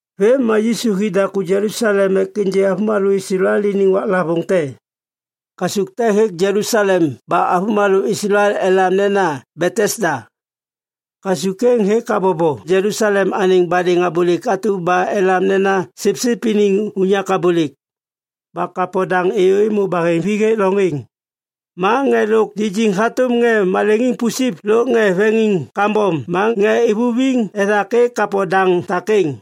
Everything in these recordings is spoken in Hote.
Vêm ma Yisu hi daku Jelusalem ek ênjê avômalô Islael iniŋ waklavôŋ te. Kasuk te hêk Jelusalem ba avômalô Islael elam nena Betesda. Kasuk êŋ hêk habobo Jelusalem anêŋ badêŋ abôlêk atu ba elam nena Sipsip iniŋ Unyak Abôlêk. Ba kapo daŋ êyô êmô baheŋvi hêk loŋ êŋ. Ma ŋê lôk lijiŋ hatôm ŋê maleŋiŋ pusip lôk ŋê veŋiŋ kambom ma ŋê ivuviŋ ethak êk kapo daŋ takêŋ.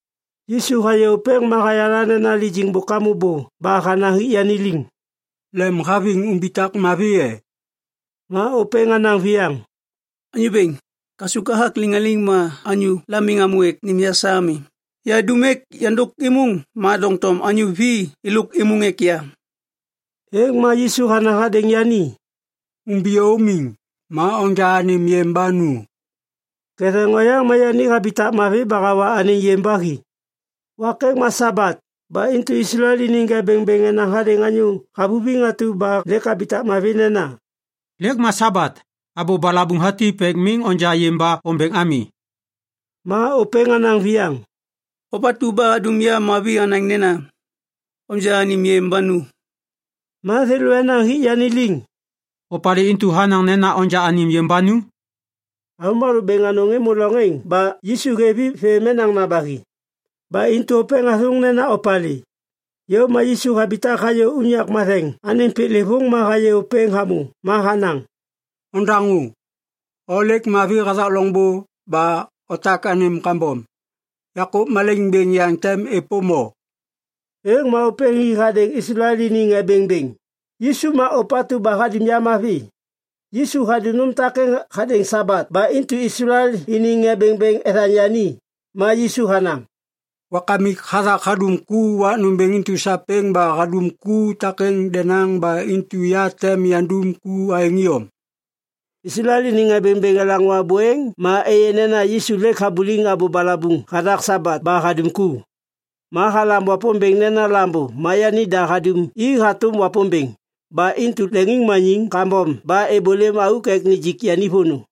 Yisu hayê ôpêŋ ma hayala nena lijiŋ bôk hamô bô ba hanaŋ hik yani liŋ, “Lemhaviŋ umbitak mavi e?” Ma ôpêŋ hanaŋ viyaŋ, “Anyô bêŋ, kasuk hathak liŋaliŋ ma anyôla miŋ hamô ek nêm ya sa ami. Yahadum ek yandôk êmôŋ ma doŋtom anyô vi êlôk êmôŋ ek ya.” Êŋ ma Yisu hanaŋ hadêŋ yani, “Umbiyô umiŋ! Ma onja anêm yêm ba nu!” Ketheŋ oyaŋ ma yani habitak mavi ba hawa anêŋ yêm ba hi. Wak êŋ ma Sabat. Ba intu Islael iniŋ ŋê bêŋbêŋ enaŋ hadêŋ anyô havuviŋ atu ba lêk habitak mavi nena, “Lêk ma Sabat! Abô balabuŋ hatip ek miŋ onja yêm ba ombeŋ ami.” Ma ôpêŋ hanaŋ viyaŋ, “Ôpatu ba hadum ya mavi hanaŋ nena, ‘Onja anêm yêm ba nu.’” Ma thêlô enaŋ hik yani liŋ, “Opalê intu hanaŋ nena onja anêm yêm ba nu?” Avômalô bêŋ anôŋ êmô loŋ êŋ ba Yisu hêv i vê menaŋna ba hi. Ba intu ôpêŋ hathôŋ nena opalê. Yôv ma Yisu habitak hayô unyak matheŋ anêŋ piklêvôŋ ma hayê ôpêŋ hamô ma hanaŋ, “Ondaŋô. O lêk mavi hathak loŋbô ba otak anêm kambom. Yakô malaiŋ bêŋ yaŋ tem êpôm o.” Êŋ ma ôpêŋ hi hanaŋ hadêŋ Islael iniŋ ŋê bêŋbêŋ, “Yisu ma ôpatu ba hadum ya mavi.” Yisu hadum nôm takêŋ hadêŋ Sabat. Ba intu Islael iniŋ ŋê bêŋbêŋ ethaŋ yani. Ma Yisu hanaŋ, “Wakamik hathak hadum ku wak nômbêŋ intu sapêŋ ba hadum ku takêŋ denaŋ. Ba intu ya tem yandum ku aêŋ iyom.” Islael iniŋ ŋê bêŋbêŋ elaŋô abô êŋ ma êyê nena Yisu lêk habuliŋ abô balabuŋ hathak Sabat ba hadum ku. Ma halam Wapômbêŋ nena Lambô ma yanida hadum i hatôm Wapômbêŋ. Ba intu leŋiŋmaniŋ kambom ba êbôlêm auk ek nijik yani vônô.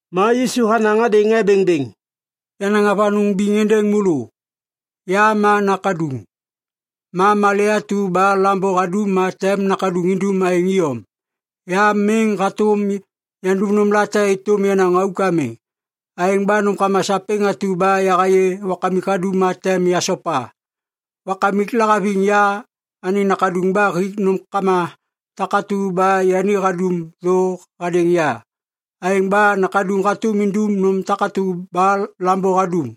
Ma Yisu hanaŋ hadêŋ ŋê bêŋbêŋ, “Yanaŋ avanôŋ biŋ êndêŋ môlô. Ya ma Nakaduŋ. Ma malê atu ba Lambô hadum ma tem Nakaduŋ indum aêŋ iyom. Ya miŋ hatôm yandum nômlate êtôm yenaŋ auk ami. Aêŋ ba nômkama sapêŋ atu ba yahayê Wakamik hadum ma tem yasopa. Wakamik lahaviŋ ya anêŋ Nakaduŋ ba hik nômkama takatu ba yani hadum thô hadêŋ ya. Aêŋ ba Nakaduŋ hatôm indum nôm takatu ba Lambô hadum.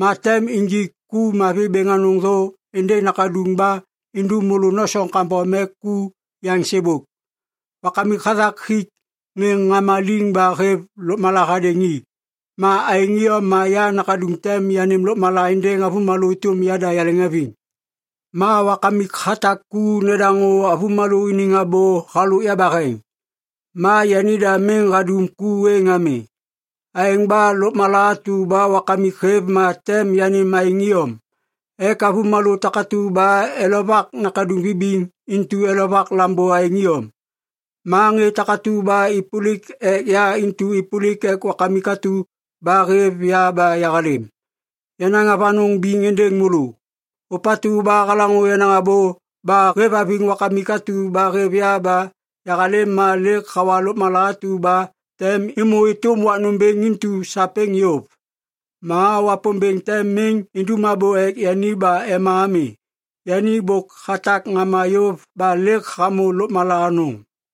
Ma tem injik ku mavi bêŋ anôŋ thô êndêŋ Nakaduŋ ba indum môlô nosoŋ kambom ek ku yaŋ sêbôk. Wakamik hathak hik ŋê ŋama liŋ ba hêv lôkmala hadêŋ i. Ma aêŋ iyom ma ya Nakaduŋ tem yanêm lôkmala êndêŋ avômalô êtôm yada yaleŋhaviŋ. Ma wakamik hatak ku nedaŋô avômalô iniŋ abô halôk yabaheŋ. Ma yanida miŋ hadum ku êŋ ami. Aêŋ ba lôkmala atu ba Wakamik hêv ma tem yanêm aêŋ iyom ek avômalô takatu ba elovak Nakaduŋ vibiŋ intu elovak Lambô aêŋ iyom. Ma ŋê takatu ba êpôlik ek ya intu êpôlik ek Wakamik atu ba hêv ya ba yahalêm. “Yanaŋ avanôŋ biŋ êndêŋ môlô. Ôpatu ba halaŋô yenaŋ abô ba hêvhaviŋ Wakamik atu ba hêv ya ba yahalêm ma lêk hawa lôkmala atu ba tem êmô êtôm wak nômbêŋ intu sapêŋ yôv. Ma Wapômbêŋ tem miŋ indum abô ek yani ba ema ami. Yani bôk hatak ŋama yôv ba lêk hamô lôkmala anôŋ.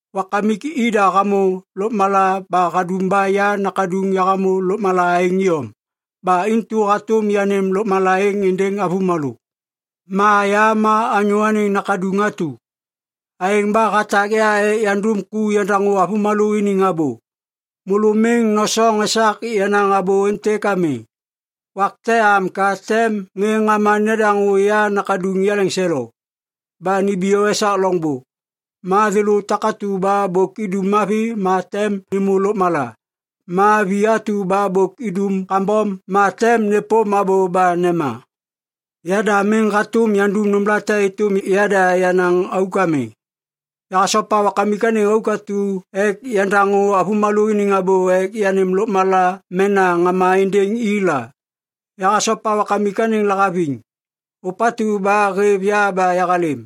“Wakamik ida hamô lôkmala ba hadum ba ya Nakaduŋ yahamô lôkmala aêŋ iyom. Ba intu hatôm yanêm lôkmala êŋ êndêŋ avômalô. Ma ya ma Anyô Anêŋ Nakaduŋ atu. Aêŋ ba hatak ya ek yandum ku yandaŋô avômalô iniŋ abô. “Môlô miŋ nosoŋ esak yenaŋ abô êntêk ami. Wak te am ka tem ŋê ŋama nedaŋô ya Nakaduŋ yaleŋselo ba nimbiyô esak loŋbô. Ma thêlô takatu ba bôk idum mavi ma tem nêmô lôkmala. Ma vi atu ba bôk idum kambom ma tem nêpôm abô ba nema. Yada miŋ hatôm yandum nômlate êtôm yada yenaŋ auk ami. Yahasopa Wakamik anêŋ auk atu ek yandaŋô avômalô iniŋ abô ek yanêm lôkmala mena ŋama êndêŋ i la. Yahasopa Wakamik anêŋ lahaviŋ, ôpatu ba hêv ya ba yahalêm.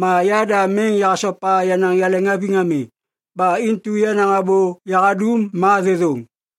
Ma yada miŋ yahasopa yenaŋ yaleŋhaviŋ ami. Ba intu yenaŋ abô yahadum ma thêthôŋ.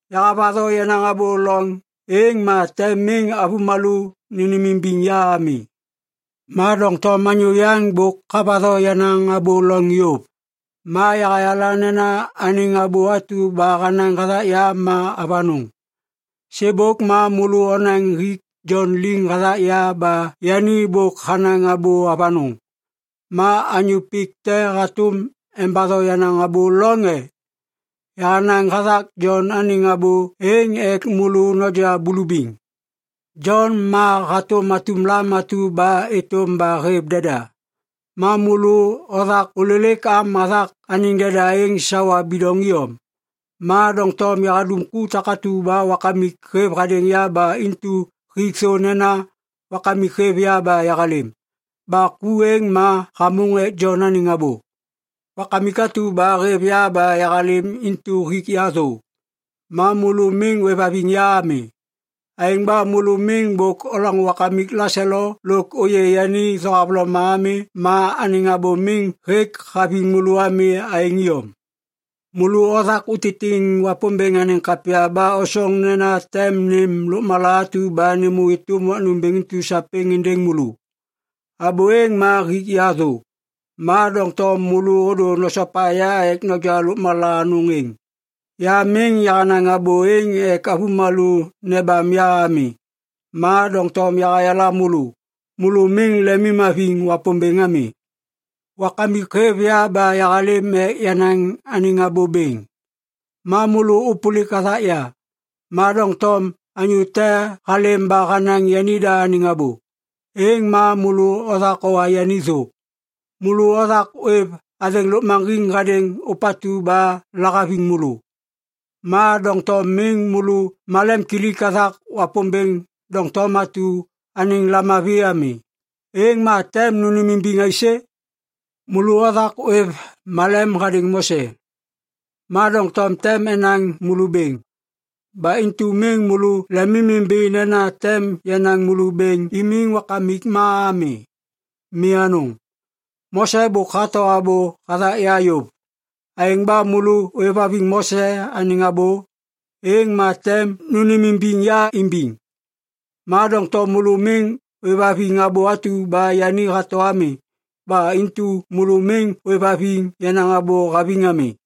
“Yahavatho yenaŋ abô loŋ êŋ ma tem miŋ avômalô nênêmimbiŋ ya ami. Ma doŋtom anyô yaŋ bôk havatho yenaŋ abô loŋ yôv. Ma yahayala nena anêŋ abô atu ba hanaŋ hathak ya ma avanôŋ. “Sêbôk ma môlô onaŋ hik Jon liŋ hathak ya ba yani bôk hanaŋ abô avanôŋ. Ma anyô pik te hatôm embatho yenaŋ abô loŋ e? Yahanaŋ hathak Jon anêŋ abô êŋ ek môlô noja bulubiŋ. Jon ma hatôm atum lam atu ba êtôm ba hêv deda. Ma môlô othak ôlêlêk am hathak anêŋ deda êŋ sawa bidoŋ iyom. “Ma doŋtom yahadum ku takatu ba Wakamik hêv hadêŋ ya ba intu hik thô nena Wakamik hêv ya ba yahalêm. Ba ku êŋ ma hamôŋ ek Jon anêŋ abô. Wakamik atu ba hêv ya ba yahalêm intu hik ya thô. Ma môlô miŋ ôêvhaviŋ ya ami. Aêŋ ba môlô miŋ bôk olaŋô Wakamik laselo lôk ôyê yani thohavloma ami ma anêŋ abô miŋ hêk haviŋ môlô ami aêŋ iyom. Môlô othak utitiŋ Wapômbêŋ anêŋ kapya ba osoŋ nena tem nêm lôkmala atu ba nêmô êtôm wak nômbêŋ intu sapêŋ êndêŋ môlô. Abô êŋ ma hik ya thô, ma doŋtom môlô ôdô nosopa ya ek noja lôkmala anôŋ êŋ. “Ya miŋ yahanaŋ abô êŋ ek avômalô nebam ya ami. Ma doŋtom yahayala môlô! Môlô miŋ lemimhaviŋ Wapômbêŋ ami. Wakamik hêv ya ba yahalêm ek yanaŋ anêŋ abô bêŋ. Ma môlô ôpôlik hathak ya. Ma doŋtom anyô te halêm ba hanaŋ yanida anêŋ abô, êŋ ma môlô othak owa yani thô! Môlô othak ôêv athêŋ lôkmaŋgiŋ hadêŋ ôpatu ba lahaviŋ môlô. Ma doŋtom miŋ môlô malemkilik hathak Wapômbêŋ doŋtom atu anêŋ lamavi ami. Êŋ ma tem nônêmimbiŋ aisê? “Môlô othak ôêv malem hadêŋ Mose. Ma doŋtom tem enaŋ môlô bêŋ. Ba intu miŋ môlô lemimimbi nena tem yanaŋ môlô bêŋ imiŋ Wakamik ma ami. Mi anôŋ! Mose bôk hato abô hathak ya yôv. Aêŋ ba môlô ôêvhaviŋ Mose anêŋ abô, êŋ ma tem nônêmimbiŋ ya imbiŋ. Ma doŋtom môlô miŋ ôêvhaviŋ abô atu ba yani hato ami. Ba intu môlô miŋ ôêvhaviŋ yenaŋ abô haviŋ ami.”